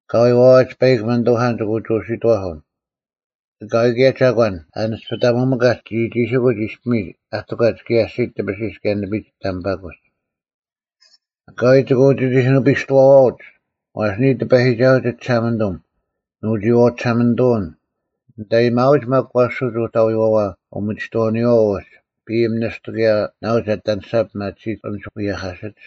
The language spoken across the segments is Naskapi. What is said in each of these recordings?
ᐊᑲᐎᔾ ᐛᐛᒡ ᐸᐃᒄ ᒥᓂᑐᐧᑲᓐ ᒋᑭ ᐅᒋ ᐅᓯᑥᓱᓐ᙮ ᐊᑲᐎᔾ ᑭᔭ ᒐᒂᓐ ᐊᓂᔅᐱᑕᒧᒥᑲᒡ ᒋᒋᒋᓯᑯᒡ ᐃᔅᐱᒥᒡ ᐊ ᑎᒂᒡ ᑭᔭ ᐊᔅᒋᒡ ᑕᐱᓯᔅ ᑭᔭ ᓂᐱᒡ ᑕᒥᐸᑯᒡ᙮ ᐊᑲᐎᔾ ᒋᑭ ᐅᒋᒋᐧᑯᓂᐱᔅᑐᐛᐛᐅᒡ, ᐛᔅ ᓂᔾ ᑎᐸᔨᒋᒐᓱᐤ ᒋᒋᓴᒪᓂᑐᒻ ᓄᒋᐃᐛᐤ ᒋᓴᒪᓂᑐᐅᓐ; ᓂᑦ ᐊᔨᒥᐊᐅᒡ ᒪᒃ ᐊᐛᓯᒡ ᐅᑕᐎᐛᐛ ᐅᒥᒋᑥᐅᓂᔪᐛ ᐅᒡ ᐱᐃᒻ ᓂᔅᑐ ᑭᔭ ᓇᐤ ᒐ ᐊᑎ ᐊᓂᔅᒐ ᐱᒪᑎᓯᒡ ᐊᓐᒡ ᐎᔭᐧᑲᓯᒡ;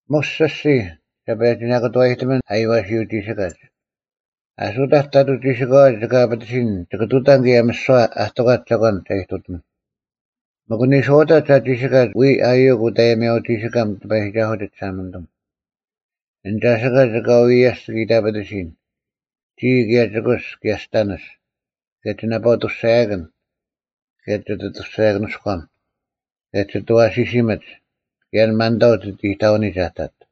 ᒧᔅ ᒋᔅᒋᔾ ᒐ ᐸᔭᒋ ᓇᑭᑐᐛᔨᑎᒥᓐ ᐊᔽᓯᐅᒋᓯᑲᒡ᙮ ᐊᓱᑕᒡ ᑕᑐᐤ ᒋᓯᑲᐛ ᒋᑭ ᐊᐱᑎᓯᓐ ᒋᑭ ᑐᑕᓐ ᑭᔭ ᒥᓯᐛ ᐊ ᑎᒂᒡ ᒐᒂᓐ ᒐ ᐃᑐᑎᒥᓐ᙮ ᒥᒄ ᓂᔄᐅᑕᒡ ᐊ ᒋᓯᑲᒡ ᐎᔾ ᐊᔪᐅᒄ ᐅᑦ ᐊᔽᓯᐅᒋᓯᑲᒻ ᑎᐸᔨᒋᒐᓱᐤ ᒋᒋᓴᒪᓂᑐᒻ᙮ ᐊᓐ ᒐᓯᑲᒡ ᐊᑲᐎᔾ ᐎᔭᔅᑦ ᒋᑭ ᐃᑕᐱᑎᓯᓐ, ᒋᔾ ᑭᔭ ᒋᑯᔅ ᑭᔭ ᒋᑕᓂᔅ, ᑭᔭ ᒋ ᓇᐸᐤ-ᐊᑐᔅᒐᔭᑭᓐ, ᑭᔭ ᒋᑦ ᐊᑐᔅᒐᔭᑭᓂᔎᒻ, ᑭᔭ ᒋᑦ ᐊᐛᓯᓯᒥᒡ, ᑭᔭ ᐊᓐ ᒪᓐᑕᐤ ᒋᑦ ᐃᑕᐅᓂᒡ ᐊᑕᑦ᙮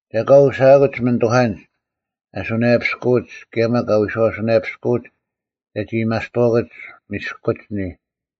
ᒐ ᐊᑲ ᐅᓯᐊᑯᒡ ᒥᓂᑐᐧᑲᓐᒡ ᐊ ᓱᓇᔭᐱᔅᑯᐅᒡ ᑭᔭ ᒪᒃ ᐊ ᐎᓴᐅᓱᓇᐱᔅᑯᐅᒡ ᒐᒋ ᐊᔭᒥᐊᔅᑐᐛᑯᒡ ᒥᔅᑯᒡ ᓂᔾ᙮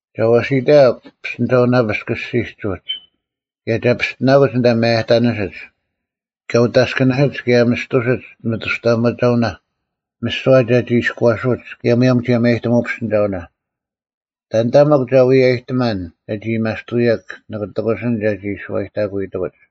ᒐ ᐛᓯᑕᔭᒄ ᐱᔅᑎᓂᒐᐅᓇᐱᔅᒄ ᐊᔅᒋᒡ ᐅᒡ ᑭᔭ ᒐ ᐱᔅᑎᓇᑯᒡ ᐊᓐᑕ ᒪᔭᑕᓂᓯᒡ, ᑲ ᐅᑦ ᐊᔅᑭᓂᓯᒡ ᑭᔭ ᒥᔅᑐᓯᒡ ᒥᑐᔅᑕᐊᒪᒐᐅᓇ ᒥᓯᐛ ᒐᒋ ᐃᔎᓱᒡ ᑭᔭ ᒧᔭᒻ ᒋᔭᒪᔨᑎᒧᐅ ᐱᔅᑎᓂᒐᐅᓇ᙮ ᑕᓐᑕ ᒥᒄ ᒐ ᐎᔭᔨᑎᒪᓐ ᒐᒋ ᐊᔭᒥᐊᔅᑕᑯᐅᔭᓐ, ᓂᑭ ᑎᑯᓯᓐ ᒐᒋ ᓱᐛᑕᑯᐎᑎᑯᒡ᙮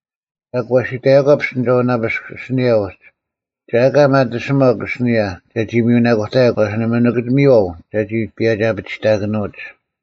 ᒐᒄ ᐛᓯᑕᔭᒂ ᐱᔅᑎᓂᒐᐅᓇᐱᔅᒄ ᐊᓯᓂᔭ ᐅᒡ, ᒐ ᐊᑲ ᒪᑎᓯᒪᒄ ᐊᓯᓂᔭ ᒐᒋ ᒥᔪᓇᑯᑕᔭᒄ ᐛᔅ ᓇᒪ ᒋᑭ ᒥᔽᐤ ᒐᒋ ᐸᔭᒋ-ᐊᐱᒋᑕᑭᓄᐅᒡ᙮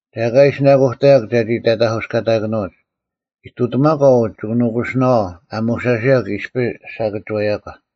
ᒐ ᐊᑲ ᐃᓯᓇᑯᑕᔭᒄ ᒐᒋ ᑕᑕᐧᑯᔅᑲᓇᓄᐅᒡ, ᐃᑐᑎᒪᒂ ᐅ ᒋᑭ ᓄᑯᓯᓇᐛᐤ ᐊ ᒧᓴᓯᔭᒄ ᐃᔅᐱ ᓴᑭᒋᐛᔭᒂ᙮